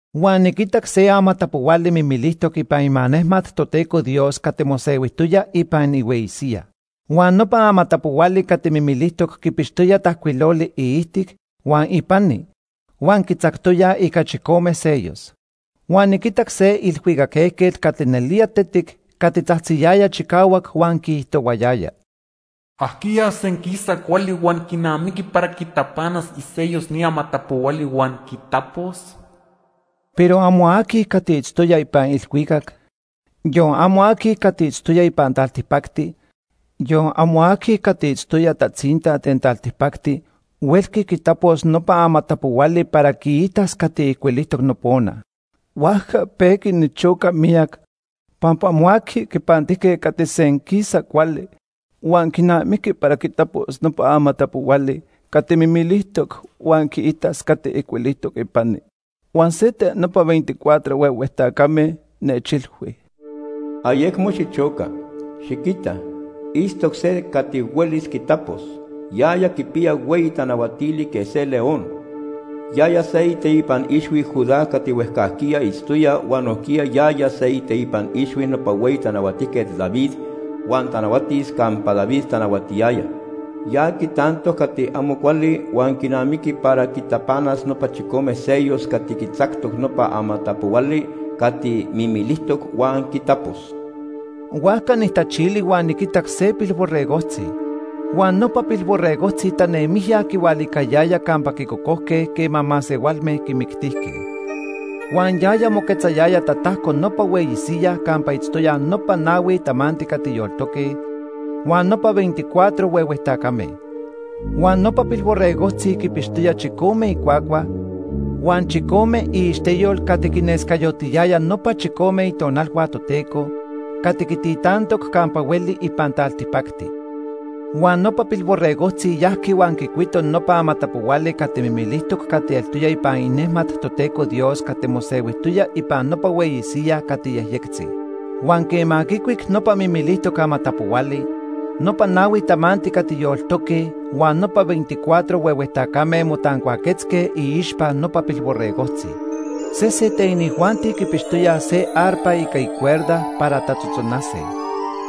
Huan niquitac se amatapohuali mimilijtoc ipan imanejmat Toteco Dios cati mosehuijtoya ipan ihueyi siyaj. Huan nopa amatapohuali cati mimilijtoc quipixtoya tajcuiloli iijtic huan ipani huan quitzactoyaj ica chicome sellos. Huan niquitac se ilhuicac ejquet cati nelía tetic cati tzajtziyaya chicahuac huan quiijtohuayaya: “¿Ajquiya senquisa cuali huan quinamiqui para quitapanas isellos ni amatapohuali huan quitapos?” Pero amo aqui cati itztoya ipan ilhuicac, yon amo aqui cati itztoya ipan taltipacti, yon amo aqui cati itztoya tatzinta ten taltipacti huelqui quitapos nopa amatapohuali para quiitas cati ijcuilijtoc nopona. Huajca pejqui nichoca miyac pampa amo aqui quipantijque cati senquisa cuali huan quinamiqui para quitapos nopa amatapohuali cati mimilijtoc huan quiitas cati ijcuilijtoc ipani. Huan se ten nopa veinticuatro huehue tacame nechilhui: “Ayecmo xichoca. Xiquita, itztoc se cati huelis quitapos. Yaya quipiya hueyi tanahuatili quej se león. Yaya se iteipan ixhui Judá cati huejcajquiya itztoya huan nojquiya yaya se iteipan ixhui nopa hueyi tanahuatijquet David huan tanahuatis campa David tanahuatiyaya. Ya quitantoc cati amo cuali huan quinamiqui para quitapanas nopa chicome sellos cati quitzactoc nopa amatapohuali cati mimilijtoc huan quitapos.” Huajca nijtachili huan niquitac se Pilborregojtzi. Huan nopa Pilborregojtzi tanemijya quihualicayaya campa quicocojque quema masehualme quimictijque. Huan yaya moquetzayaya tatajco nopa hueyi siyaj campa itztoyaj nopa nahui tamanti cati yoltoque huan nopa veinticuatro huehue tacame. Huan nopa Pilborregojtzi quipixtoya chicome icuacua huan chicome iixteyol cati quinescayotiyaya nopa chicome Itonalhua Toteco cati quintitantoc campa hueli ipan taltipacti. Huan nopa Pilborregojtzi yajqui huan quicuito nopa amatapohuali cati mimilijtoc cati eltoya ipan inejmat Toteco Dios cati mosehuijtoya ipan nopa hueyi siyaj cati yejyectzi. Huan quema quicuic nopa mimilijtoc amatapohuali, nopa nahui tamanti cati yoltoque huan nopa veinticuatro huehue tacame motancuaquetzque iixpa nopa Pilborregojtzi. Sesen ten inijuanti quipixtoyaj se arpa ica icuerda para tatzotzonase.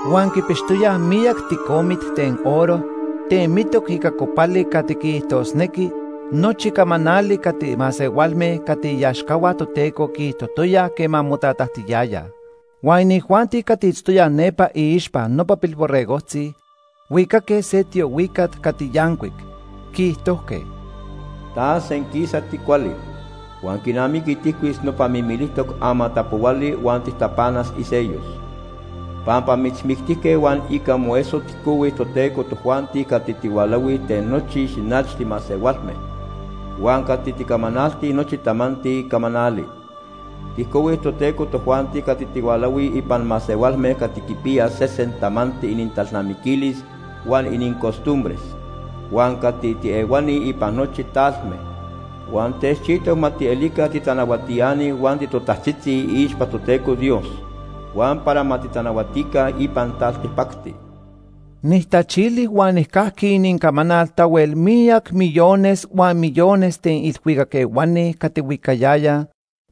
Huan quipixtoyaj miyac ticomit ten oro temitoc ica copali cati quiijtosnequi nochi camanali cati masehualme cati iaxcahua Toteco quiijtojtoyaj quema motatajtiyayaj. Huan inijuanti cati itztoyaj nepa iixpa nopa Pilborregojtzi huicaque se tiohuicat cati yancuic, quiijtojque: “Ta senquisa ticuali. Huan quinamiqui tijcuis nopa mimilijtoc amatapohuali huan tijtapanas isellos. Pampa mitzmictijque huan ica moeso tijcohui Toteco tojuanti cati tihualahui ten nochi xinachti masehualme, huan cati ticamanaltij nochi tamanti camanali. Tijcohui Toteco tojuanti cati tihualahuij ipan masehualme cati quipiyaj sesen tamanti inintalnamiquilis huan inincostumbres, huan cati tiehuani ipan nochi talme. Huan techchijtoc ma tielica titanahuatiani huan titotajtzitzi iixpa Toteco Dios, huan para ma titanahuatica ipan taltipacti.” Nijtachili huan nijcajqui inincamanal tahuel miyac millones huan millones ten ilhuicac ehuani cati huicayayaj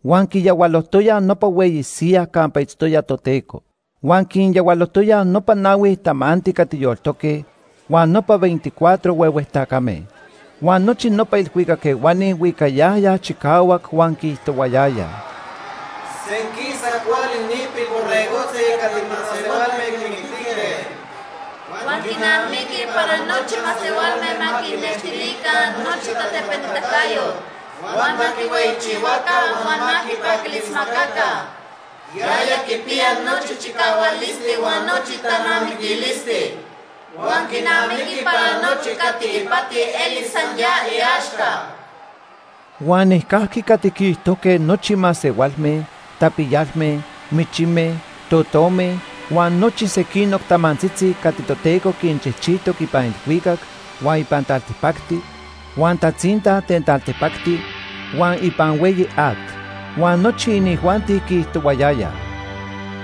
huan quiyahualojtoyaj nopa hueyi siyaj campa itztoya Toteco. Huan quinyahualojtoyaj nopa nahui tamanti cati yoltoque huan nopa veinticuatro huehue tacame. Huan nochi nopa ilhuicac ehuani huicayayaj chicahuac huan quiijtohuayayaj: “Senquisa cuali ni Pilborregojtzi cati masehualme quimictijque. Huan quinamiqui para nochi masehualme ma quinextilica nochi tatepanitacayot, huan ma quihueyichihuaca huan ma quipaquilismacaca. Yaya quipiya nochi chicahualisti huan nochi talnamiquilisti. Huan quinamiqui para nochi cati ipati elis san ya iaxca.” Huan nijcajqui cati quiijtojque nochi masehualme, tapiyalme, michime, totome, huan nochi sequinoc tamantzitzi cati Toteco quinchijchijtoc ipan ilhuicac, huan ipan taltipacti, huan tatzinta ten taltipacti, huan ipan hueyi at. Huan nochi inijuanti quiijtohuayayaj: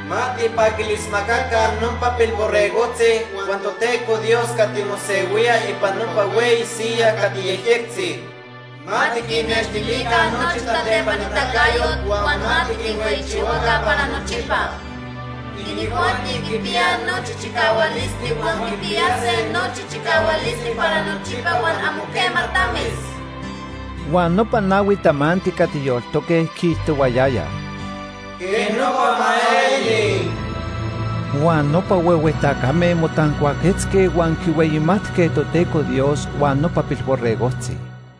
“Ma tijpaquilismacaca nopa Pilborregojtzi huan Toteco Dios cati mosehuía ipan nopa hueyi siyaj cati yejyectzi. Ma tiquinnextilica nochi tatepanitacayot, huan ma tiquinhueyichihuaca para nochipa. Inijuanti quipiyaj nochi chicahualisti huan quipiyase nochi chicahualisti para nochipa huan amo quema tamis.” Huan nopa nahui tamanti cati yoltoque quiijtohuayayaj: “¡Quej nopa ma eli!” Huan nopa huehue tacame motancuaquetzque huan quihueyimatque Toteco Dios huan nopa Pilborregojtzi.